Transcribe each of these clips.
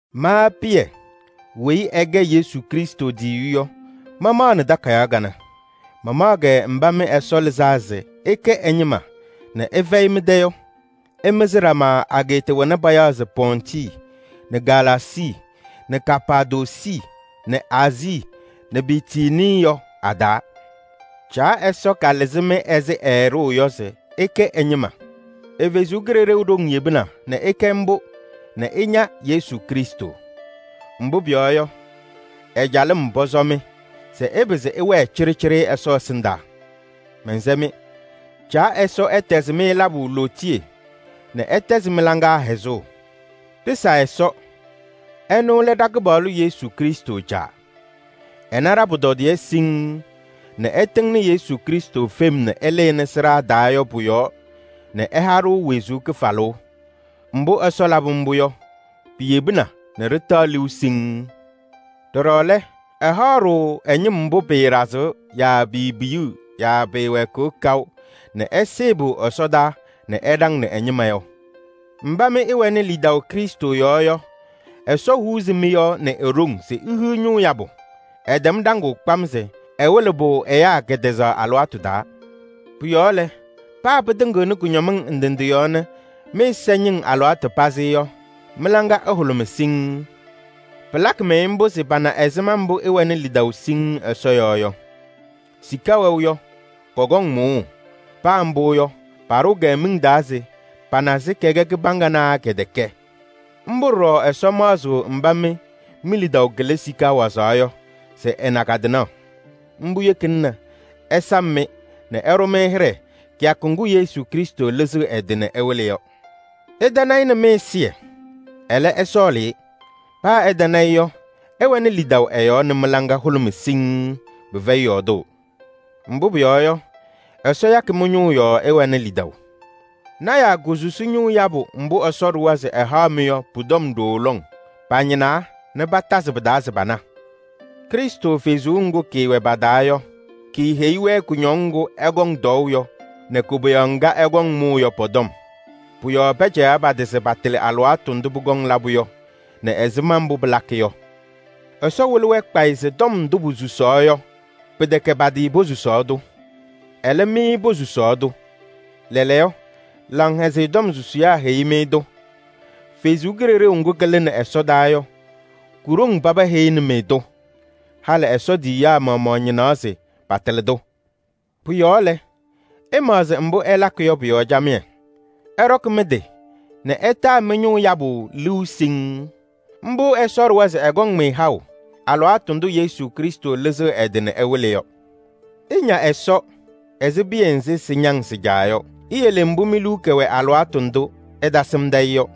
Ma Pɩyɛ weyi ɛkɛ Yesu Krɩstʋ tiyiyu yɔ, mamaɣnɩ takayaɣ kanɛ. Mamaɣ-kɛ mba mɩ Ɛsɔ lɩzaa se ɩkɛ ɛ-ñɩma nɛ ɩfɛyɩ mɩ-tɛ yɔ. Ɩmɩzɩ ɖama ageeta wena payaɣ se Pɔntɩ nɛ Galaasii nɛ Kapaadoosi nɛ Aazii nɛ Bitinii yɔ a-taa. Caa Ɛsɔ kalɩzɩ-mɩ ɛzɩ ɛɛɖʋʋ yɔ se ɩkɛ ɛ-ñɩma. Ɛ-Kalɩzaɣ ɖoŋ yebina nɛ ɩkɛ mbʋ nɛ ɩña Yesu Krɩstʋ. Mbʋ pʋyɔɔ yɔ, ɛ-calɩm pɔsɔ-mɩ se ɩpɩzɩ ɩwɛɛ cɩɖɩcɩɖɩ Ɛsɔ ɛsɩndaa. Mɛnsɛ-mɩ: Caa Ɛsɔ ɛtɛzɩ-mɩ labʋ lootiye nɛ ɛtɛzɩ mɩ-laŋa hɛzʋʋ. Ɖɩsa Ɛsɔ, ɛnʋ lɛ ɖa-Kɩpaɣlʋ Yesu Krɩstʋ Caa. Ɛna ɖa-pʋtɔdɩyɛ siŋŋ nɛ ɛtɩŋnɩ Yesu Krɩstʋ fem nɛ ɛlɩnɩ sɩɖaa taa yɔ pʋ-yɔɔ nɛ ɛha-ɖʋ wezuu kɩfalʋʋ. Mbʋ Ɛsɔ labɩ mbʋ yɔ, piyebina nɛ ɖɩtaɣ liu siŋŋ. Ɖɔɖɔ lɛ, ɛhaɣ-ɖʋ ɛ-ñɩm mbʋ pɩɩɖazɩɣ yaa piipiyiɣ yaa pɩɩwɛɛkɩɣ kaʋ nɛ ɛsɩɩ-pʋ ɛsɔdaa nɛ ɛɖaŋnɩ ɛ-ñɩma yɔ. Mba mɩ ɩwɛnɩ lidaʋ Krɩstʋ yɔɔ yɔ, Ɛsɔ huuzi mɩ-yɔɔ nɛ e-ɖoŋ se ihiɣ ñʋʋ yabʋ. Ɛtɛm ɖaŋʋʋ kpam se ɛwɩlɩ-pʋ ɛyaa kɛtɛzaɣ alɩwaatʋ taa. Pʋ-yɔɔ lɛ, paa pɩtɩŋɩɣnɩ kʋñɔmɩŋ ndɩ ndɩ yɔɔ nɛ mɩ-ɛza ñɩŋ alɩwaatʋ pazɩ yɔ, mɩ-laŋa ɛhʋlʋmɩ siŋŋ. Pɩlakɩ-mɩ mbʋ se pana ɛzɩma mbʋ ɩwɛnɩ lidaʋ siŋŋ Ɛsɔ yɔɔ yɔ. Sika wɛʋ yɔ, kɔkɔŋ mʋʋʋ. Paa mbʋ yɔ, paɖʋʋ-kɛ miŋ taa se pana se kɛkɛ kɩbaŋga naa kɛtɛkɛ. Mbʋ ɖɔɖɔ Ɛsɔ maɣzɩɣ mba mɩ mi-lidaʋ kɩlɩ sika wazaɣ yɔ se ɛna kɩ-tɩnaɣ. Mbʋ yekina nɛ ɛsam-mɩ nɛ ɛɖʋ-mɩ hɩɖɛ kɩyakʋ ŋgʋ Yesu Krɩstʋ lɩzɩɣ ɛ-tɩ nɛ ɛwɩlɩ yɔ. Ɩtana-ɩ nɛ mɩ-ɛzɩyɛ, ɛlɛ ɩsɔɔlɩ-ɩ. Paa ɩtana-ɩ yɔ, ɩwɛnɩ lidaʋ ɛ-yɔɔ nɛ mɩ-laŋa hʋlʋmɩ siŋŋ, pɩfɛyɩ yɔɔdʋʋ. Mbʋ pʋyɔɔ yɔ, Ɛsɔ yakɩ mɩ-ñʋʋ yɔɔ ɩwɛnɩ lidaʋ. Lɔɔyɩsɩ tɩnaa kosusi ñʋʋ yabʋ mbʋ Ɛsɔ ɖʋwa se ɛhaɣ-mɩ yɔ pʋ-tɔm ɖooo lɔŋ. Pañɩnaa nɛ patazɩ pɩ-taa se pana. Krɩstʋ Kalɩzaɣ ŋga kaawɛ pa-taa yɔ, kaaheyi-wɛ kʋñɔŋ ŋgʋ ɛkɔŋ tɔɔʋ yɔ nɛ koboyaɣ ŋga ɛkɔŋ mʋʋ yɔ pɔ-tɔm. Pʋ-yɔɔ pɛcɛyaɣ pa-tɩ se patɩlɩ alɩwaatʋ ndʋ pʋkɔŋ labʋ yɔ nɛ ɛzɩma mbʋ pɩlakɩ yɔ. Ɛsɔ wɩlɩ-wɛ kpayɩ se tɔm ndʋ posusaɣ yɔ, pɩtɛkɛ pa-tɩ posusaɣ-tʋ. Ɛlɛ, mɩ posusaɣ-tʋ. Lɛɛlɛɛyɔ, Laŋhɛzɩyɛ Tɔm susiyaa heyi-mɩ-tʋ. Ɛsɔ Kalɩzaɣ ŋga kalɩnɩ ɛsɔdaa yɔ, ko-ɖoŋ paba heyini-mɩ-tʋ. Halɩ Ɛsɔ tiyiyaa maɣmaɣ ñɩnaɣ se patɩlɩ-tʋ. Pʋ-yɔɔ lɛ, ɩmaɣzɩ mbʋ ɩlakɩ yɔ pʋ-yɔɔ camɩyɛ. Ɩɖɔkɩ mɩ-tɩ nɛ ɩtaa mɩ-ñʋʋ yabʋ liu siŋŋ. Mbʋ Ɛsɔ ɖʋwa se ɛkɔŋ-mɩ haʋ alɩwaatʋ ndʋ Yesu Krɩstʋ lɩzɩɣ ɛ-tɩ nɛ ɛwɩlɩ yɔ. Ɩña Ɛsɔ ɛzɩ piya nzɩ sɩñaŋ sɩ-caa yɔ. Iyele mbʋ mi-liu kɛwɛ alɩwaatʋ ndʋ ɩtasɩmdɩ-ɩ yɔ.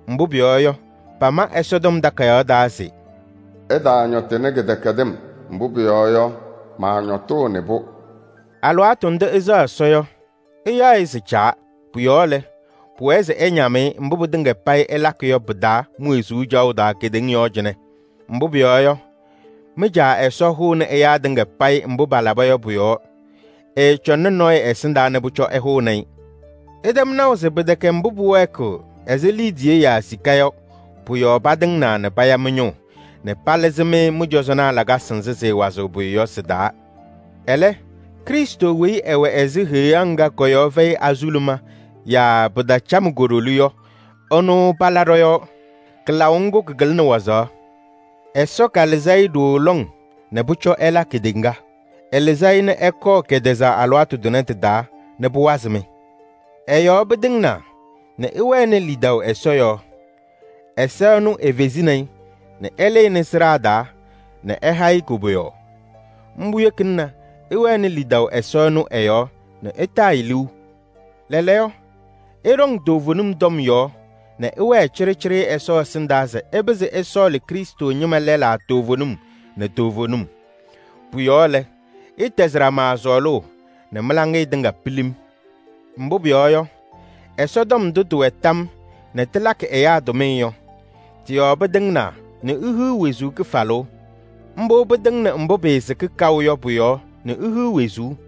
Mbʋ pʋyɔɔ yɔ, pama Ɛsɔtɔm Takayaɣ taa se: “Ɩtaañɔtɩnɩ kɩdɛkɛdɩm, mbʋ pʋyɔɔ yɔ, maañɔtʋʋnɩ-pʋ.” Alɩwaatʋ ndʋ ɩsɛɣ Ɛsɔ yɔ, ɩyaɣ-ɩ se Caa. Pʋ-yɔɔ lɛ, pʋwɛɛ se ɩñam-ɩ mbʋ pɩtɩŋa payɩ ɩlakɩ yɔ pɩ-taa mi-wezuu caɣʋ taa kedeŋa yɔɔ cɩnɛ. Mbʋ pʋyɔɔ yɔ, mɩ-Caa Ɛsɔ hʋʋnɩ ɛyaa tɩŋa payɩ mbʋ palaba yɔ pʋ-yɔɔ. Ɛɛcɔŋnɩ nɔɔyʋ ɛsɩndaa nɛ pʋcɔ ɛhʋnɩ-ɩ. Ɩtɛm naʋ se pɩtɛkɛ mbʋ pʋwɛɛkɩɣ ɛzɩ liidiye yaa sika yɔ pʋ-yɔɔ patɩŋnaa nɛ paya mɩ-ñʋʋ nɛ palɩzɩ-mɩ mɩ-cɔzɔnaa lakasɩ nzɩ sɩɩwazɩɣ pʋyʋ yɔ sɩ-taa. Ɛlɛ, Krɩstʋ weyi ɛwɛ ɛzɩ heɣa ŋga kɔ-yɔɔ fɛyɩ azuluma yaa pɩtacam ko-ɖoli yɔ, ɛnʋ pala ɖɔ-yɔɔ. Kɩlaʋ ŋgʋ kɩkɩlɩnɩ wazaɣ. Ɛsɔ kalɩzɩ-ɩ ɖooo lɔŋ nɛ pʋcɔ ɛla kedeŋa. Ɛlɩzɩ-ɩ nɛ ɛkɔɔ kɛtɛzaɣ alɩwaatʋ tʋnɛ tɩ-taa nɛ pʋwazɩ-mɩ. Ɛ-yɔɔ pɩtɩŋnaa nɛ ɩwɛnɩ lidaʋ Ɛsɔ yɔɔ. Ɛsɔ ɛnʋ efezini-i nɛ ɛlɩnɩ sɩɖaa taa nɛ ɛha-ɩ koboyaɣ. Mbʋ yekina nɛ ɩwɛnɩ lidaʋ Ɛsɔ ɛnʋ ɛ-yɔɔ nɛ ɩtaa-ɩ. Lɛɛlɛɛyɔ, ɩɖɔŋ toovenim tɔm yɔɔ nɛ ɩwɛɛ cɩɖɩcɩɖɩ Ɛsɔ ɛsɩndaa se ɩpɩzɩ ɩsɔɔlɩ Krɩstʋ ñɩma lɛlaa toovenim. Pʋ-yɔɔ lɛ, ɩtɛzɩ ɖama sɔɔlʋʋ nɛ mɩ-laŋɩyɛ tɩŋa pilim. Mbʋ pʋyɔɔ yɔ, Ɛsɔtɔm ndʋ tɩwɛ tam nɛ tɩlakɩ ɛyaa tʋmɩyɛ yɔ, tɩ-yɔɔ pɩtɩŋnaa nɛ ihiɣ wezuu kɩfalʋʋ. Mbʋ pɩtɩŋnɩ mbʋ pɩɩsɩkɩ kaʋ yɔ pʋ-yɔɔ nɛ ihiɣ wezuu.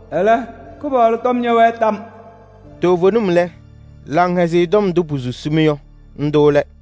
Ɛlɛ, Kɩpaɣlʋ tɔm ñɛwɛɣ tam.” Toovenim lɛ, Laŋhɛzɩyɛ Tɔm ndʋ posusi-mɩ yɔ, ndʋ lɛ.